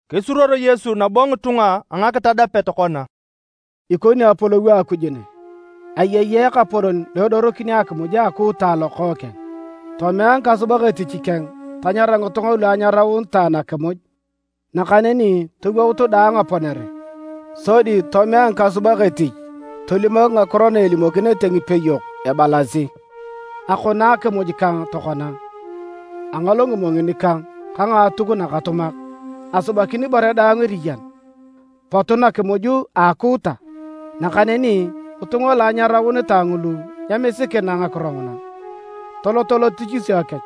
Kisuruor Yesu nabo ngitunga a ngakitadapet kona, “Ikoni Apolou a Akuj ne. Ayei ekapolon lo edorokini akimuj a akuuta alokookeng. Tomea ngikasubak etich keng tanyarata ngitunga lu anyaraunitae nakimuj, nakaneni towout daang aponere. Sodi tomea ngikasubak etich tolimok ngakiro na elimokinete ngipeyok ebalasi: ‘Akono akimuj kang tokona. Angol ngimongin kang ka ngaatuk nakatumak. Asubakin ibore daang eriyan. Potu nakimuj a akuuta’. Nakaneni ngitunga lu anyaraunitae ngulu nyemisikina ngakiro nguna, toloto lotichisio kech.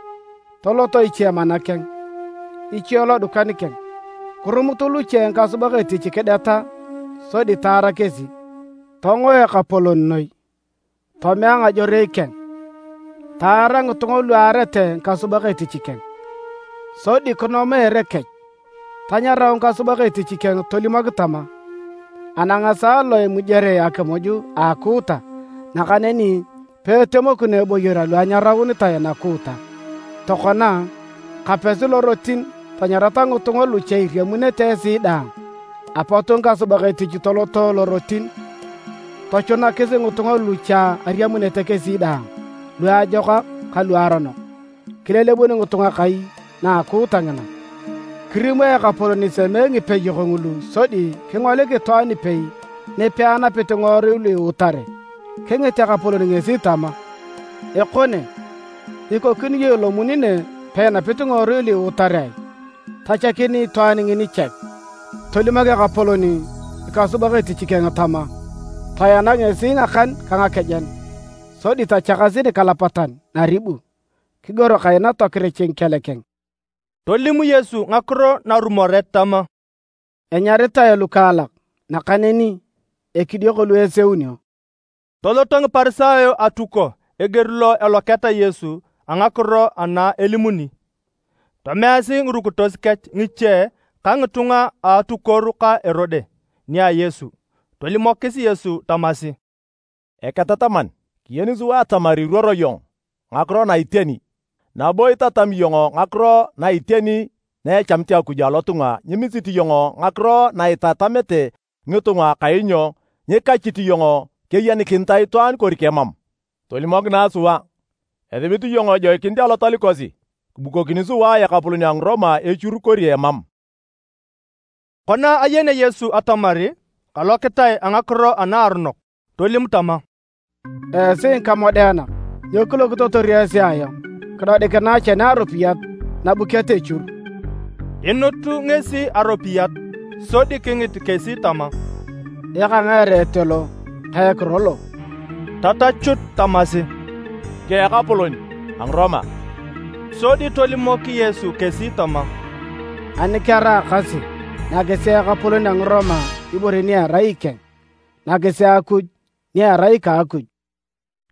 Tolot iche mana keng, iche lodukan keng. Kirumut luche ngikasubak etich kideta sodi taara kesi. Tongo ekapolon noi, tomea ngajorei keng, taara ngitunga lu aarete ngikasubak etich keng, sodi kinoma ere kech. Tanyarau ngikasubak etich keng tolimok tama, ‘Anang esaa lo imujere akimuj a akuuta nakaneni peetemokino eboyor alu anyaraunitae nakuuta. Tokona, kapesi lorotin tanyarata ngitunga lu cha iriamunete esi daang’. Apot ngikasubak etich toloto lorotin tochunakis ngitunga lu cha ariamunete kesi daang, luajokak ka luaronok, kilelebun ngitunga kai na akuuta ngina. “Kirimo ekapolon isemee ngipeyok ngulu sodi kingolik itwaan ipei ni peanapit ngiworui lu iutare. Kingit ekapolon ngesi tama, ‘Ekone, ikokini iyong ilomuni nege peinapit ngiworui lu iutare ai?’ Tachakin itwaan ngini chek. Tolimok ekapolon ngikasubak etich tama, ‘Toena ngesi ngakan ka ngakejen, sodi tochakasi nikalapatan naribu. Kigor kaina tokirich ngikel keng.’” Tolim Yesu ngakiro narumoret tama, “Enyaritae lukaalak, nakaneni ekidioko lu eseunio.” Toloto Ngiparisayo atuko eger lo eloketa Yesu a ngakiro ana elimuni. Tomeasi ngirukitos kech ngiche ka ngitunga a atukuoru ka Erode nia Yesu. Tolimokis Yesu tamasi, “Eketataman, kiyeni sua atamar iruoro iyong ngakiro na iteni. Nabo itatami iyong ngakiro na iteni na echamit Akuj alotunga nyimisit iyong ngakiro na itamete ngitunga kainyo nyikachit iyong keyenikinitae itwaan kori kemam. Tolimokinae sua, esibit iyong ejoikinit alotal kosi kibukokini sua ekapolon a Ngiroma echur kori emam?” Kona ayenea Yesu atamar kalokitae a ngakiro anaaronok, tolim tama, “Esi ngikamodeanak! Nyo kilokitotor esi ayong? Kidodikinae chene aropiyat nabuket echur!” Inut ngesi aropiyat, sodi kingit kesi tama, “Eka ngae ereet lo ka ekiro lo?” Tatachut tamasi, “Ngika a ekapolon a Ngiroma”. Sodi tolimok Yesu kesi tama, “Ani keraakasi, nakisi ekapolon a Ngiroma ibore ni erai ikeng, nakis Akuj ni erai ika Akuj.”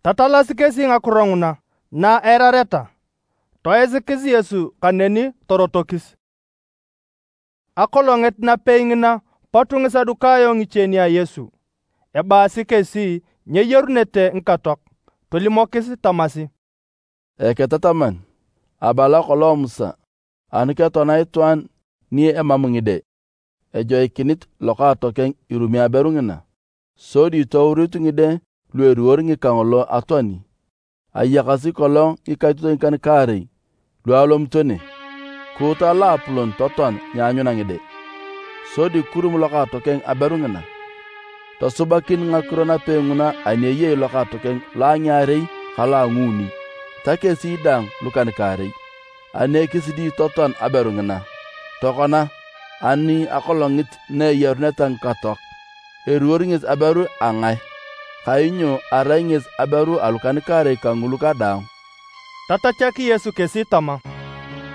Tatalasi kesi ngakiro nguna na eirareta, toisikis Yesu kaneni torotokis. Akolongit napei ngina, pot Ngisadukayo ngiche nia Yesu (ebaasi kesi nyeyarunete ngikatoak). Tolimokis tamasi, “Eketataman, abala kolong Musa, ani ketoana itwaan ni emam ngide, ejoikinit lokaatokeng irumi aberu ngina, sodi touriut ngide lu eliwor ngika ngolo atoani. Ayakasi kolong ngikaitotoi ngikan-kaarei lu alomito ne. Kuuta loapolon totoan nyeanyuna ngide, sodi kirum lokaatokeng aberu ngina. Tosubakin ngakiro napei nguna ani eyei lokaatokeng lo a ngiarei, ka lo a nguuni, ta kesi daang lukan-kaarei. Ani ekisidi totoan aberu ngina. Tokona, ani akolongit na eyaruneta ngikatoak, eliwor ngesi aberu a ngae? Kainyo arai ngesi aberu alukan-kaarei kangulu kadaang.” Tatachak Yesu kesi tama,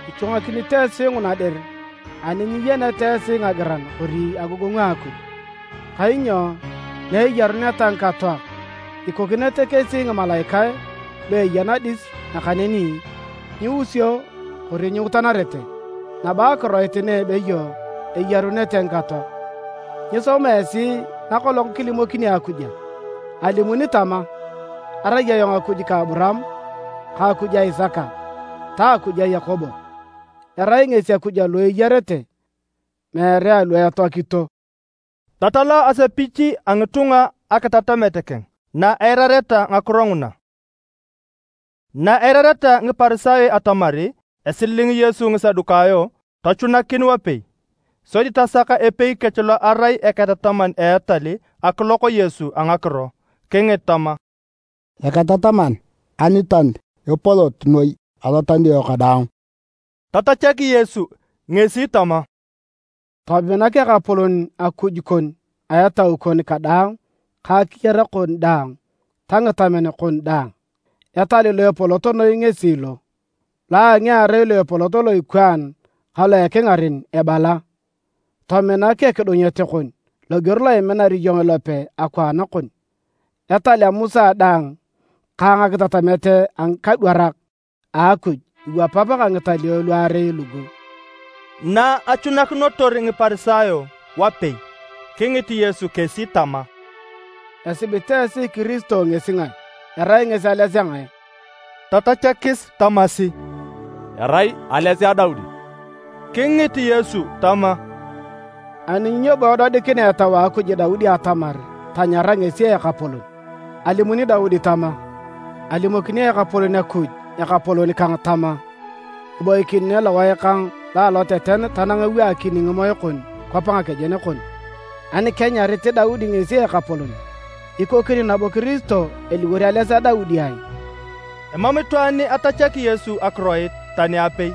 “Ichwangakinito esi nguna dir ani nyiyeneta esi ngagiran kori agogongu a Akuj! Kainyo na eyaruneta ngikatoak, ikokinete kesi ngimalaikae lu eya nadis nakaneni nyiusio kori nyiutanarete. Nabo akiroit na ebeyo eyarunete ngikatoak, nyisoma esi na kolong kilimokini Akuj a? Alimuni tama, ‘Arai ayong Akuj ka Aburaam ka Akuj a Isaka ta Akuj a Yakobo’. Erai ngesi Akuj alu eyarete, meere alu etoakito.” Tatala asepich a ngitunga akitatamet keng na eirareta ngakiro nguna. Na eirareta Ngiparisayo atamar esililing Yesu Ngisadukayo, tochunakin wapei, sodi tasak epei kech lo arai eketataman a etal akilok Yesu a ngakiro. Kingit tama, “Eketataman, alital epolot noi alotalio kadaang?” Tatachak Yesu ngesi tama, “Tominak Ekapolon Akuj kon a etau kon kadaang ka akiyar kon daang ta ngitamen kon daang. Etal lo epolot noi ngesi lo. Lo a ngiarei lo epolot lo ikwaan ka lo ekingaren ebala, ‘Tominak ekidunyet kon loger lo iminar iyong ilope akwaan kon.’ Etal a Musa daang ka ngakitatamet a ngikadwarak a Akuj iwapap ka ngitalio luarei lugu.” Na achunakinotor Ngiparisayo wapei, kingit Yesu kesi tama, “Esibit esi Kiristo ngesi ngae? Erai ngesi ales a ngae?” Tatachakis tamasi, “Erai ales a Daudi.” Kingit Yesu tama, “Ani nyo bo edodikinea Etau a Akuj Daudi atamar tanyara ngesi, Ekapolon? Alimuni Daudi tama: ‘Alimokini Ekapolon Akuj Ekapolon kang tama, kiboikin ne lowae kang lo aloteten tanang ewaakini ngimoe kon kwap ngakejen kon.’ Ani kenyarit Daudi ngesi Ekapolon, ikokini nabo Kiristo eliwor ales a Daudi ai?” Emam itwaan atachaki Yesu akiroit tani apei,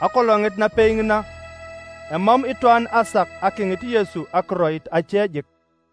akolongit napei ngina, emam itwaan asak akingit Yesu akiroit ache jik.